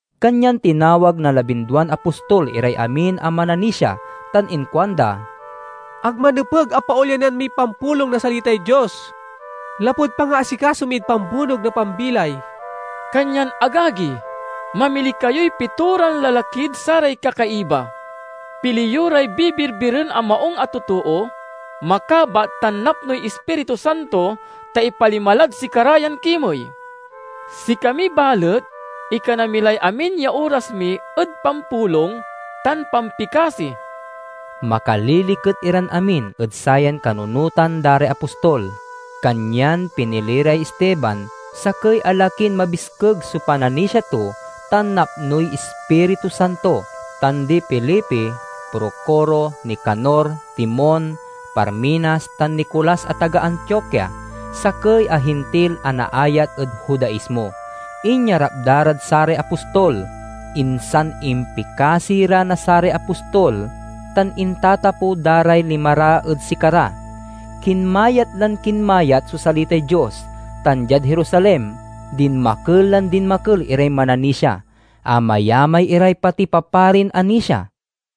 Kanyan tinawag na labinduan apostol iray amin a mananisia tan inkuanda, "Ag manepeg a paolyanan miy pampulong na salitay Dios, lapud pangaasikaso mid pambunog na pambilay. Kanyan, agagi, mamili kayoy pitoran lalakid saray kakaiba. Pili yo ray bibirbiren a maung a totoo, makabat tan napnoy Ispiritu Santo, ta ipalima lad sikara yan kimey. Sikami, balet, ikana mi lay amin ya oras mi ed pampulong tan pampikasi." Makaliliket iran amin ed sayan kanunotan da ray apostol, kanyan pinili ray Esteban, sakey a lakin mabiskeg so pananisia to tan napnoy Ispiritu Santo, tan di Felipe, Procoro, Nicanor, Timon, Parmenas, tan Nicolas a taga Antioquia, sakey a Hintil a naayat ed Judaismo. Inyarap da rad saray apostol; insan impikasi ra na saray apostol, tan intatapew da ray lima ra ed sikara. Kinmayat lan kinmayat so salitay Dios, tan diad Jerusalem dinmakel lan dinmakel iray mananisia. Amayamay iray pati paparin anisia.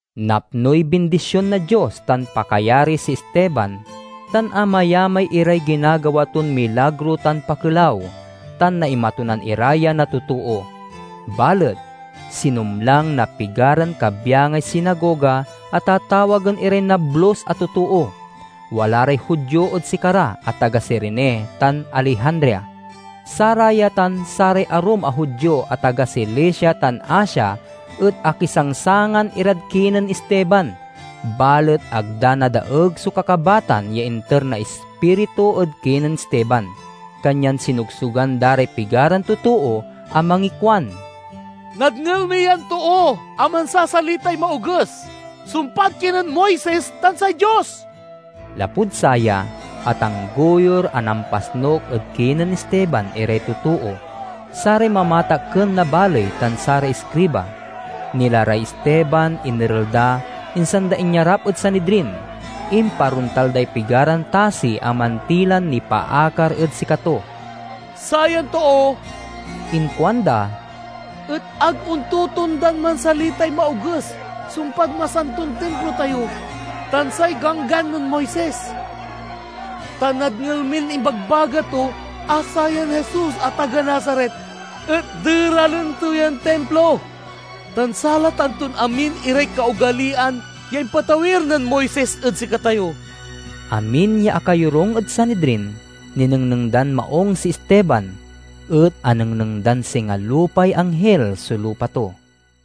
Napnoy bindision na Dios tan pakayari si Esteban, tan amayamay iray ginagawa ton milagro tan pakelaw, tan naimatunan ira ya na totoo. Balet, sinumlang na pigaran kabyangay sinagoga a tatawagen iray Nablus a Totoo. Wala ray Judio ed sikara a taga Cirene tan Alejandria. Saraya tan saray arum a Judio a taga Cilicia tan Asia et akisangsangan irad kinen Esteban. Balet ag da nadaeg so kakabatan ya inter na Ispiritu ed kinen Esteban. Kanyan sinogsogan da ray pigaran totoo a mangikuan, "Nadngel mi yan too a mansasalitay maoges sumpad kinen Moises tan say Dios!" Lapud saya, atanggoyur a nampasnuk ed kinen Esteban iray totoo, saray mamatakken na baley, tan saray iskriba. Nila ray Esteban, inerel da, insan da inyarap ed Sanidrin. Imparontal day pigaran tasi a mantilan nipaakar ed sikato. "Sayan too," inkuanda, "et ag ontotondan mansalitay maoges sumpad masanton Timplo tayo tan say Ganggan nen Moises. Ta nadngel min imbagbaga to a sayan Jesus a taga Nazaret et deralen to yan Timplo, tan salatan ton amin iray kaogaliyan ya impatawir nen Moises ed sikatayo." Amin ya akayorung ed Sanidrin ninengneng dan maung si Esteban, et anengneng dan singa lupay anghil so lupa to.